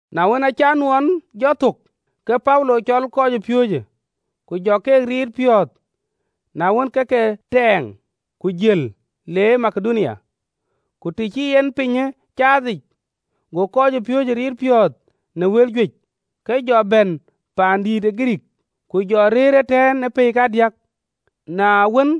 Na wën, aacï anuɔɔn jɔ thök, ke Paulo cɔl kɔcpiööcë, ku jɔ ke riit piɔ̈ɔ̈th, na wën, ke ke tɛ̈ɛ̈ŋ, ku jël le Makedonia. Ku të cï en pinyë caathic, go kɔcpiööcë riit piɔ̈ɔ̈th në wël juëc, ke jɔ bɛ̈n paan ë Girikii. Ku jɔ rëër ëtɛ̈ɛ̈n ë pɛ̈i kadiäk, na wën,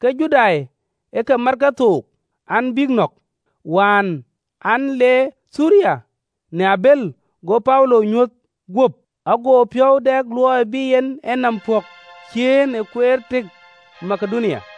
ke Judai ë ke mat kethook an, bïk nɔ̈k, wään an, le Thiriya në abël, go Paulo ŋic, ago piɔ̈u dɛ luɔi bï en enɔm pɔ̈k ciëën ë kueer tëk Makedonia.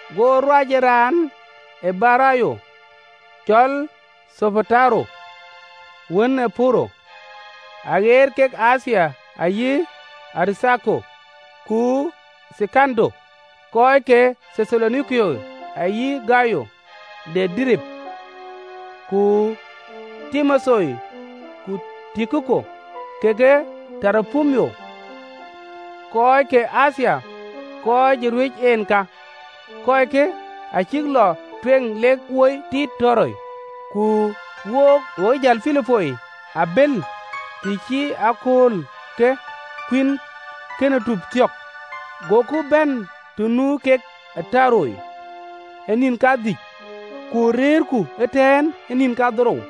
Go ruac ë raan ë Beroya cɔl Thopataro, wën ë Puro, aɣeet kek Athia, ayï Aritharko ku Thekando, kɔc ke Thethalonike, ayï Gayo de Derbe, ku Timotheo, ku Tukiko kekë Toropimo, kɔc ke Athia, kɔc ë ruɛc en, ka. Kɔckë acïk lɔ tueŋ lek wo tiit Toroa. Ku wook, wo ë jël Pilipoi ë abël, të cï akööl ke Dhuëëŋ de Kuïn Cïnic Luɔu thök, goku bɛ̈n të nu kek ë Toroa ë nïn kadhïc, ku rɛ̈ɛ̈rku ëtɛ̈ɛ̈n ë nïn kadhorou.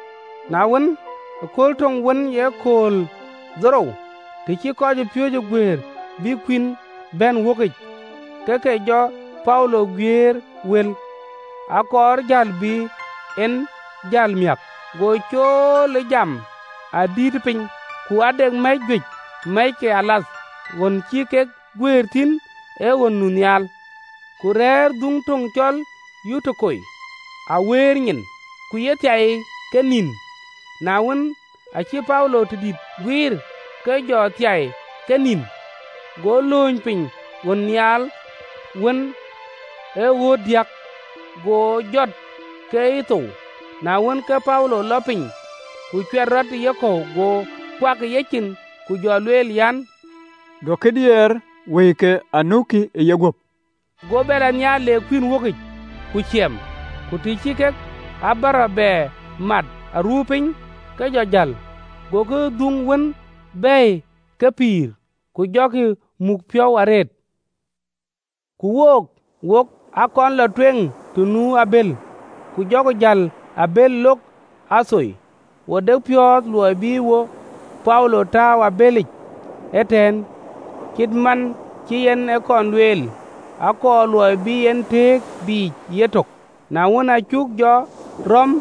Na wën, ë kööl töŋ wën ee akööl dhorou, të cï kɔcpiööcë guëër bïk kuïn bɛ̈n wökic, ke ke jɔ Paulo guiëër wël, akɔɔr jäl bï en jäl miäk, go cool ë jam adïïtë piny. Ku ade mɛ̈c juëc mɛ̈ckealath, ɣön cï kek guëër thïn, ee ɣön nu nhial. Ku rɛ̈ɛ̈r dhuŋ töŋ cɔl Yutuko awëërnyin, ke cï thiai ke nïn, na wën, aacï Paulo tëdït guiir, ke jɔ thiai ke nïn, go lööny piny ɣön nhial, wën ee ɣööt diäk, go jɔt ke cï thou. Na wën, ke Paulo lɔ piny, ku cuɛt rɔt ë yekɔ̈u, go kuak ë yecin, ku jɔ lueel an, “Duökï diɛɛr, wëike anukï ë yeguöp!” Go bɛ lɔ nhial, le kuïn wökic, ku ciɛm, ku të cï kek abärɔ bɛ mat aruu piny, ke jɔ jäl. Gokï dhuŋ wën bɛ̈ɛ̈i ke pïïr, ku jɔ ke muk piɔ̈ɔ̈th arëët. Ku wook, wok aa kɔn lɔ tueŋ të nu abël, ku jɔku jäl ë abël lok Atho, wo de piɔ̈ɔ̈th luɔi bï wo Paulo tääu ë abëlic ëtɛ̈ɛ̈n, cït man cï yen e kɔn lueel, akɔɔr luɔi bï en tëëk biic yetök. Na wën, acuk jɔ rɔ̈m ë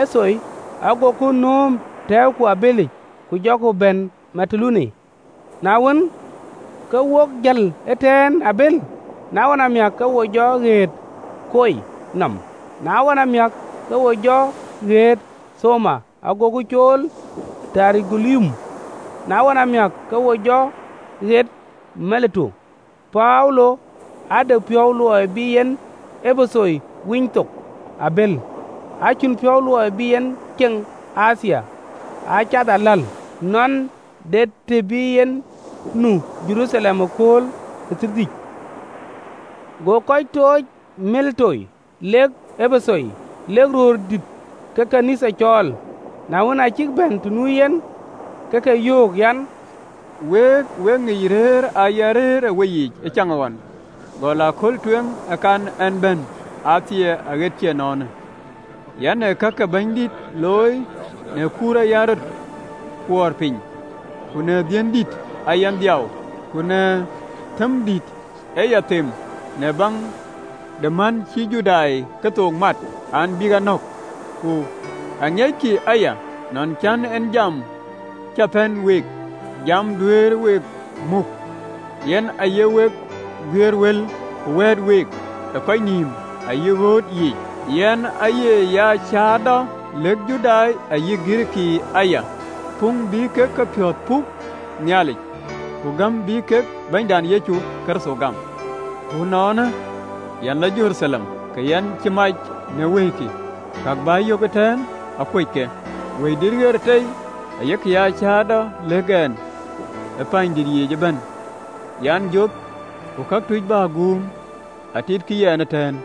Atho, agoku nööm, tɛ̈ɛ̈uku ë abëlic, ku jɔku bɛ̈n Mitulene. Na wën, ke wok jël ëtɛ̈ɛ̈n ë abël, na ɣɔn amiäk, ke wo jɔ ɣet ë Kio nɔm, na ɣɔn amiäk, ke wo jɔ ɣet Thamo, agoku cool Terogilium, na ɣɔn amiäk, ke wo jɔ ɣet Mileto. Paulo aa de piɔ̈u luɔi bï en Epetho winy thok ë abël, acïn piɔ̈u luɔi bï en ceŋ në Athia, aa cath aläl, nɔn de të bï en nu Jeruthalem ë kööl ë Thiërdhïc. Go kɔc tooc ë Mileto lek Epetho, lek röördït ke ɣön ë Nhialic cɔɔl. Na wën, aa cïk bɛ̈n të nu yen, ke ke yöök an, “Week, wek ŋic rëër aa yɛn rëër ë weyiic ë caŋɣɔn gɔl ëkööl tueŋ ë kan ɛn bɛ̈n Athia aɣet cï ënɔɔnë. Yɛn ee ka ke Bɛ̈nydït looi në kuur aa yɛn rɔt kuɔɔr piny, ku në dhiën dït aa yɛn dhiau ku në thëm dït ee ya them në baŋ de män cïï Judai kethook mat, an, bïk a nɔ̈k. Ku aŋiɛckï aya nɔn cïn en jam cä pɛ̈n week, jam duëër we muk, yɛn aaye week guiëër wël ku wɛ̈ɛ̈t week ë kɔc nïïm ayï ɣööt yiic. Yɛn aaye cäätɔ aya, cäätɔ lɛ̈k Judai ayï Girikii puŋ bï kek kepiɔ̈ɔ̈th pɔ̈k Nhialic, ku gäm bï kek Bɛ̈nydït Yecu Kërtho gam. Ku ënɔɔnë, yɛn lɔ Jeruthalem, ke yɛn cï mac në wëikï, ka bä yök ëtɛ̈ɛ̈n akuöc ke. Wëidït ɣer tei ayek aa cäätɔ, lëk ɛn ë pɛ̈ɛ̈nydït yiic ëbɛ̈n an, joth ku këtuc bä guum atitkï yɛn ëtɛ̈ɛ̈n.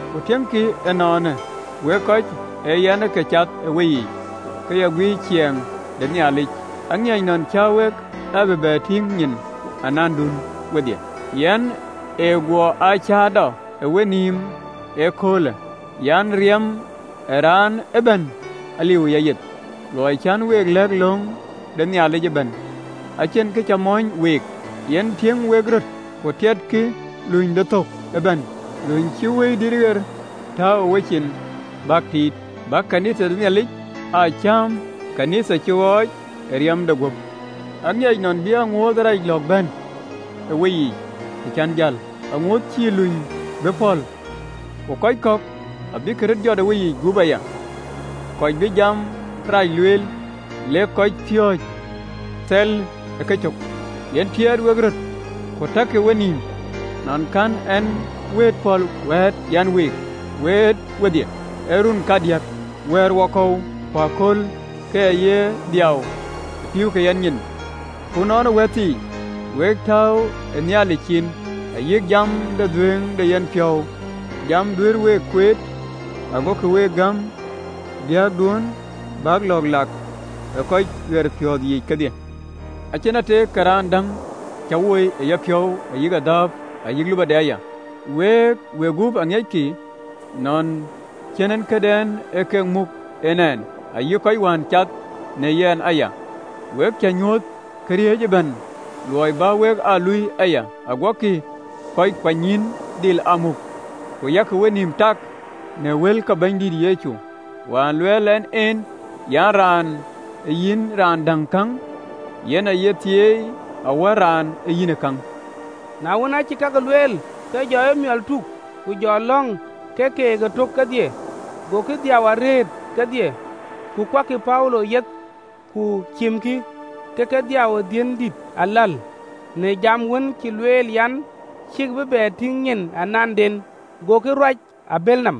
“Ku tiëŋkï ënɔɔnë, wek kɔc aa yɛn ke cath ë weyiic, ke ya guiir ciɛɛŋ de Nhialic, aŋiɛc nɔn cä wek a bï bɛ tïŋ nyin anandun wedhie. Yɛn cï guɔ aa cäätɔ ë wenïïm ee köölë an, Riɛm ë raan ëbɛ̈n aliu ë yayeth. Luɔi cän week lɛ̈k löŋ de Nhialic ëbɛ̈n, acïn kë cä mɔ̈ny week. Yen tiëŋ wek röt, ku tiɛtkï luny de thök ëbɛ̈n, luny cïï Wëidït ɣer tääu ë wecin an bäk tiit, bäk ɣön ë Nhialic aa cääm, ɣön cï ɣɔɔc ë riɛmde guöp. Aŋiɛc nɔn bï aŋuööth rac lɔ̈ɔ̈k bɛ̈n ë weyiic, të cän jäl, aŋuööth cïï luny bï pɔ̈l. Akööl abïk bɛ̈n, akööl bïï kɔc kɔ̈k röt jɔt ë weyiic gup, kɔc bï jam rac lueel, le kek kɔcpiööcë thɛl ë kecök. Yɛn tiɛɛt wek röt, ku takkï wenïïm nɔn kɛ̈n ɛn wëët pɔ̈l wëët aa yɛn week wɛ̈ɛ̈t wedhie ë run kadiäk, wɛ̈ɛ̈rwakɔ̈u ku aköl, ke ya ye dhiau ë pïïu ke yɛn nyin. “Ku ënɔɔnë, wäthii, wek tääu ë Nhialic cin, ayï jam de dhuëëŋ de yenpiɔ̈u, jam duëër week kueet, agokï week gäm biäkduön bäk lɔ̈ɔ̈k lak ë kɔc piɛthpiɔ̈ɔ̈th yiic kedhie. Acïn ateek ke raan däŋ cä woi ë yapiɔ̈u, ayï adhääp ayï lupɔde aya. Week wegup aŋiɛckï, nɔn ee cinkiënkë kek aa muk ɛn, ayï kɔc wään cath në yɛn aya. We cä nyuöth këriëëc ëbɛ̈n, luɔi bä wek aa luui aya, aguɔkï kɔc kuanynyïïn dhil aa muk, ku yak wenïïm tak në wël ke Bɛ̈nydït Yecu, wään lueel en en an, ‘Raan yïn raan däŋ käŋ, yen aye thieei awär raan ë yïnë käŋ.”’ Na wën, acï kakë lueel, ke jɔ emiɔl tuk, ku jɔ lɔ̈ŋ ke keek ëtök kedhie. Gokï dhiau arëët kedhie, ku kuakkï Paulo yeth, ku cimkï, ke ke dhiau ë dhiën dït aläl, në jam wën cï lueel an, cïkï bï bɛ tïŋ nyin ananden. Gokï lɔ në yen të de abël.